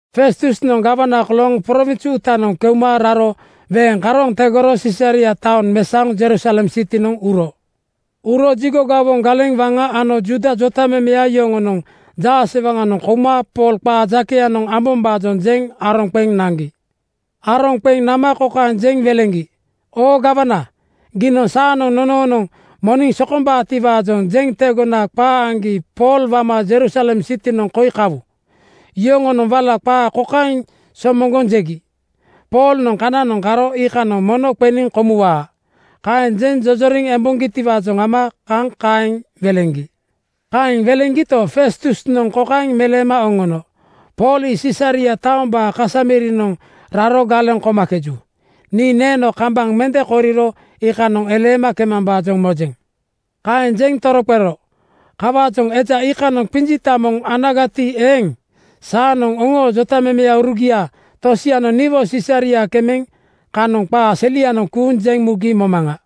Festusnoŋ gawana kolooŋ prowins uutanoŋ keuma raro weeŋ karooŋ tegoro Sisaria taoŋ mesaoŋ Jerusalem sitinoŋ uro. Uro jigo gawoŋ galeŋ waŋa ano Juuda jotamemeya yoŋonoŋ jaasewaŋanoŋ kouma Pool qaa jakeyanoŋ ambombaajoŋ jeŋ aroŋ qeŋ naŋgi. Aroŋ qeŋ nama kokaeŋ jeŋ weleŋgi, “Oo gawana, giinoŋ saanoŋ nononoŋ moniŋ sokombaatiwaajoŋ jeŋ tegona qaa aŋgi Pool wama Jerusalem sitinoŋ koi kawu.” Yoŋonoŋ wala qaa kokaeŋ somoŋgoŋ jegi, “Poolnoŋ kananoŋ karo iikanoŋ mono qeniŋ komuwaa.” Kaeŋ jeŋ jojoriŋ emboŋgitiwaajoŋ ama kaŋ kaeŋ weleŋgi. Kaeŋ weleŋgito, Festusnoŋ kokaeŋ meleema oŋono, “Pool ii Sisaria taombaa kasa mirinoŋ raro galeŋ komakeju. Nii neeno kambaŋ mende koriro iikanoŋ eleema kemambaajoŋ mojeŋ.” Kaeŋ jeŋ toroqero, “Kawaajoŋ eja iikanoŋ qinjita moŋ anagati eeŋ, saanoŋ oŋoo jotamemeurugia tosianoŋ niwo Sisaria kemeŋ kanoŋ qaa selianoŋ kuuŋ jeŋ mugi momaŋa.”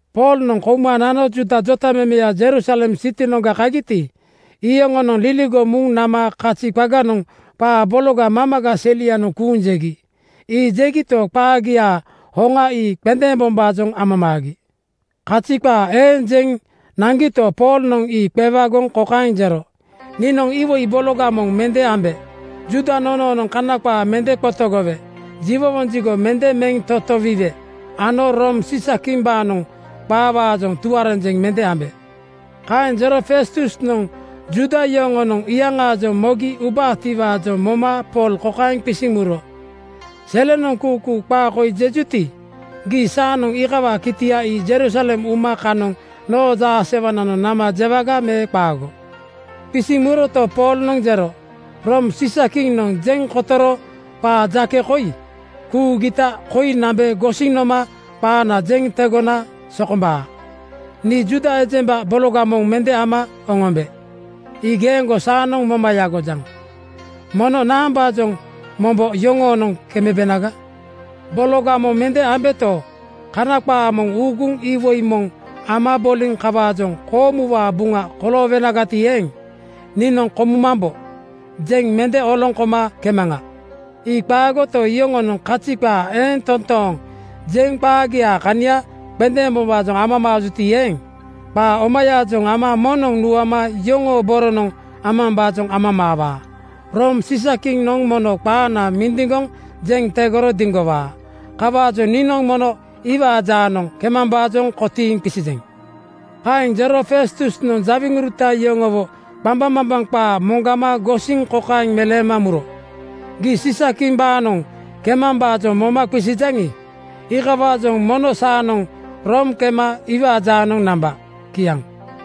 Poolnoŋ kouma nano Juuda jotamemeya Jerusalem sitinoŋga kagiti, iyoŋonoŋ liligoŋ muŋ nama kazi qaganoŋ qaa bologa mamaga selianoŋ kuuŋ jegi. Ii jegito, qaagiaa hoŋa ii qendeembombaajoŋ amamaagi. Kazi qaa eeŋ jeŋ naŋgito, Poolnoŋ ii qewagoŋ kokaeŋ jero, “Niinoŋ iwoi bologa moŋ mende ambe. Juuda nonoonoŋ Kana qaa mende qotogowe. Jiwowoŋ jigo mende meŋ totowiwe ano Room Siisakimbaanoŋ qaawaajoŋ tuarenjeŋ mende ambe.” Kaeŋ jero Festusnoŋ Juuda yoŋonoŋ iyaŋaajoŋ mogi ubaatiwaajoŋ moma Pool kokaeŋ qisiŋ muro, “Selenoŋ kuukuu qaa koi jejuti, gii saanoŋ iikawaa kitia ii Jerusalem uma kanoŋ noo jaasewananoŋ nama jewaga me qaago?” Qisiŋ muroto, Poolnoŋ jero, “Room Siisakiŋnoŋ jeŋ kotoro qaa jake koi kuugita koi nambe gosiŋ noma qaana jeŋ tegona sokombaa. Nii Juuda ejemba bologa moŋ mende ama oŋombe. Ii geeŋgo saanoŋ moma yagojaŋ. Mono naambaajoŋ mombo yoŋoonoŋ kembenaga? Bologa moŋ mende ambeto, Kana qaa moŋ uuguŋ iwoi moŋ ama boliŋ kawaajoŋ koomuwaa buŋa koloowenagati eeŋ, ‘Niinoŋ komumambo,’ jeŋ mende oloŋ koma kemaŋa. Ii qaagoto, yoŋonoŋ kazi qaa eeŋ toontooŋ jeŋ qaagiaa kania qendeembombaajoŋ amamaajuti eeŋ, qaa omayaajoŋ ama moŋnoŋ nuama yoŋoo boronoŋ amambaajoŋ amamaawaa. Room Siisakiŋnoŋ mono qaana mindiŋgoŋ jeŋ tegoro diŋgowaa. Kawaajoŋ niinoŋ mono iwaa jaanoŋ kemambaajoŋ kotiiŋ qisijeŋ.” Kaeŋ jero Festusnoŋ jawiŋuruta yoŋowo qambaŋmambaŋ qaa moŋgama gosiŋ kokaeŋ meleema muro, “Gii Siisakimbaanoŋ kemambaajoŋ moma qisijaŋi, iikawaajoŋ mono saanoŋ Room kema iwaa jaanoŋ namba.” Kiaŋ.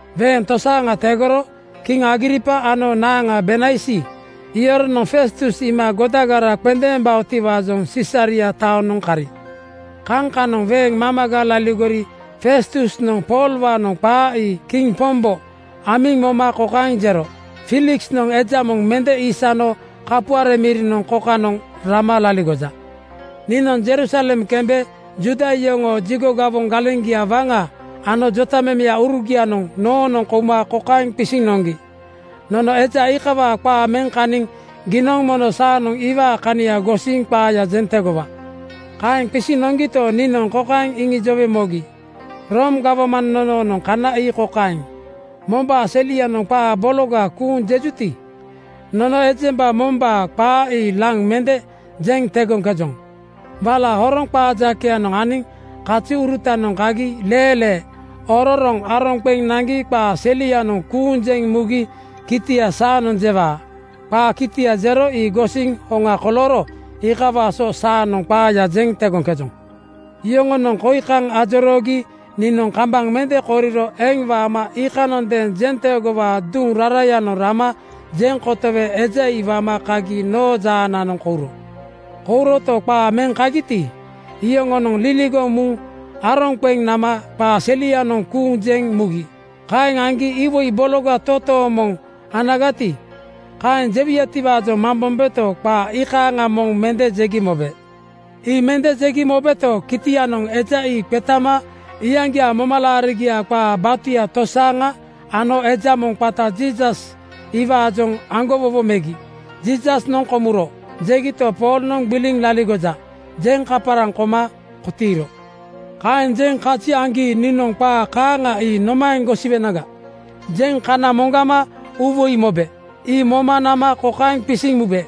Weeŋ tosaaŋa tegoro kiŋ Agripa ano naaŋa Bernaisi yoronoŋ Festus iima godagara qendeembaotiwaajoŋ Sisaria taonoŋ kari. Kaŋ kanoŋ weeŋ mamaga laligori Festusnoŋ Poolwaanoŋ qaa ii kiŋ pombo amiŋ moma kokaeŋ jero, “Fiiliksnoŋ eja moŋ mende isano kapuare mirinoŋ kokanoŋ rama laligoja. Niinoŋ Jerusalem kembe Juuda yoŋoo jigo gawoŋ galeŋgia waŋa ano jotamemeurugianoŋ noonoŋ kouma kokaeŋ qisiŋ noŋgi, ‘Nono eja iikawaa qaa meŋ kaniŋ giinoŋ mono saanoŋ iwaa kania gosiŋ qaaya jeŋ tegowa.’ “Kaeŋ qisiŋ noŋgito, niinoŋ kokaeŋ iŋijowe mogi, ‘Room gawman nonoonoŋ kana ii kokaeŋ: Mombaa selianoŋ qaa bologa kuuŋ jejuti, nono ejemba mombaa qaa ii laŋ mende jeŋ tegoŋkejoŋ. Wala horoŋ qaa jakeyanoŋ aniŋ kaziurutanoŋ kagi leelee ororoŋ aroŋ qeŋ naŋgi qaa selianoŋ kuuŋ jeŋ mugi kitia saanoŋ jewaa. Qaa kitia jero ii gosiŋ hoŋa kolooro iikawaa so saanoŋ qaaya jeŋ tegoŋkejoŋ.’ Yoŋonoŋ koi kaŋ ajoroogi niinoŋ kambaŋ mende koriro eŋ waama iikanondeeŋ jenteegowaa duŋ rarayanoŋ rama jeŋ kotowe eja ii wama kagi noo jaananoŋ kouro. “Kouroto, qaa meŋ kagiti, iyoŋonoŋ liligoŋ muŋ aroŋ qeŋ nama qaa selianoŋ kuuŋ jeŋ mugi. Kaeŋ aŋgi iwoi bologa totooŋ moŋ anagati, kaeŋ jewuyatiwaajoŋ mambombeto, qaa iikaaŋa moŋ mende jegi mobe. Ii mende jegi mobeto, kitianoŋ eja ii qetama iyaŋgiaa momalaarigiaa qaa batuya tosaaŋa ano eja moŋ qata Jiisas iwaajoŋ aŋgowowo megi. ‘Jiisasnoŋ komuro,’ jegito, Poolnoŋ ‘Gbiliŋ laligoja,’ jeŋ kaparaŋ koma kotiiro. Kaeŋ jeŋ kazi aŋgi niinoŋ ‘Qaa kaaŋa ii nomaeŋ gosiwenaga?’ jeŋ kana moŋgama uuwoi mobe. Ii moma nama kokaeŋ qisiŋ mube,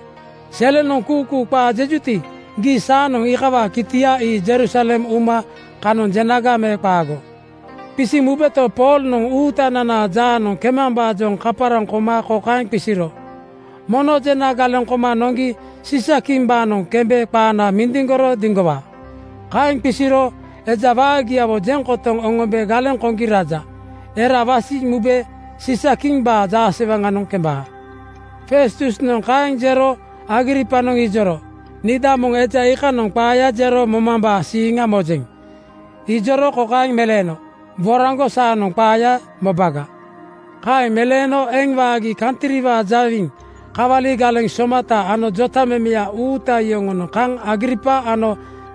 ‘Selenoŋ kuukuu qaa jejuti, gii saanoŋ iikawaa kitia ii Jerusalem uma kanoŋ jenaga me qaago?’ Qisiŋ mubeto, Poolnoŋ Uutananaa jaanoŋ kemambaajoŋ kaparaŋ koma kokaeŋ qisiro, ‘Mono jena galeŋ koma noŋgi Siisakimbaanoŋ kembe qaana mindiŋgoro diŋgowaa.’ Kaeŋ qisiro eja waagiawo jeŋ kotoŋ oŋombe galeŋ koŋgi raja. Era wasiŋ mube Siisa-kimbaa jaasewaŋanoŋ kembaa.” Festusnoŋ kaeŋ jero Agripanoŋ ijoro, “Niida moŋ eja iikanoŋ qaaya jero momambaa siiŋa mojeŋ.” Ijoro kokaeŋ meleeno, “Woraŋgo saanoŋ qaaya mobaga.” Kaeŋ meleeno eŋ waagi kantriwaa jawiŋ, kawali galeŋ somata ano jotamemeya uuta yoŋonoŋ kaŋ Agripa ano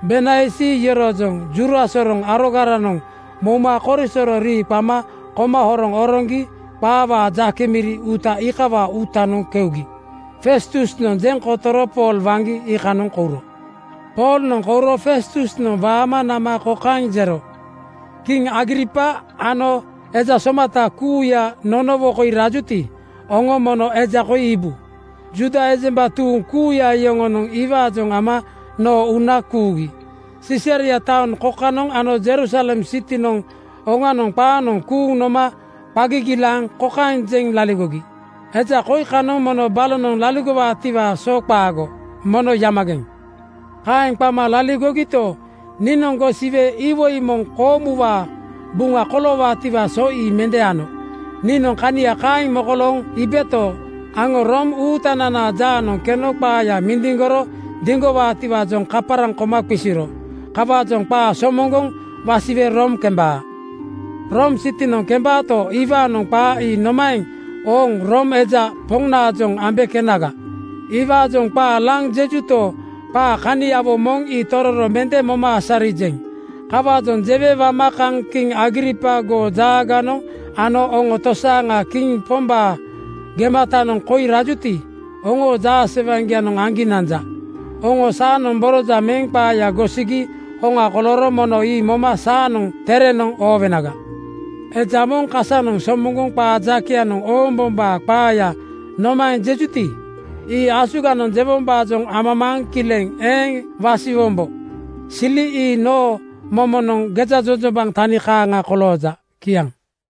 Bernaisi yoroojoŋ jura soroŋ arogaranoŋ mouma korisoro rii qama koma horoŋ oroŋgi qaawaa jake miri uuta iikawaa uutanoŋ keugi. Festusnoŋ jeŋ kotoro Pool waŋgi iikanoŋ kouro. Poolnoŋ kouro Festusnoŋ waama nama kokaeŋ jero, “Kiŋ Agripa ano eja somata kuuya nonowo koi rajuti, oŋo mono eja koi iibu. Juuda ejemba tuuŋ kuuya yoŋonoŋ iwaajoŋ ama noo uuna kuugi. Sisaria taoŋ kokanoŋ ano Jerusalem sitinoŋ oŋanoŋ qaanoŋ kuuŋ noma qa gigilaaŋ kokaeŋ jeŋ laligogi, ‘Eja koi kanoŋ mono balonoŋ laligowaatiwaa so qaago. Mono yamageŋ!’ “Kaeŋ qama laligogito, niinoŋ gosiwe iwoi moŋ koomuwaa buŋa koloowaatiwaa so ii mende ano. Niinoŋ kania kaeŋ mokolooŋ iibeto, aŋo Room Uutananaa jaanoŋ keno qaaya mindiŋgoro diŋgowaatiwaajoŋ kaparaŋ koma qisiro. Kawaajoŋ qaa somoŋgoŋ wasiwe Room kembaa. Room sitinoŋ kembaato, iwaanoŋ qaa ii nomaeŋ ooŋ Room eja Poŋnaajoŋ ambe kenaga? Iwaajoŋ qaa laŋ jejuto, qaa kaniawo moŋ ii tororo mende moma asarijeŋ. Kawaajoŋ jewe wama kaŋ kiŋ Agripa goo jaaganoŋ ano oŋo tosaaŋa kiŋ pombaa gematanoŋ koi rajuti, oŋoo jaasewaŋgianoŋ aŋgi nanja. Oŋo saanoŋ borojaŋ meŋ qaaya gosigi hoŋa kolooro mono ii moma saanoŋ terenoŋ oowenaga. Eja moŋ kasanoŋ somoŋgoŋ qaa jakeyanoŋ oombombaa qaaya nomaeŋ jejuti, ii asuganoŋ jewombaajoŋ amamaaŋ kileŋ eeŋ wasiwombo. Sili ii noo momonoŋ gejajojombaŋ tani kaaŋa kolooja.” Kiaŋ.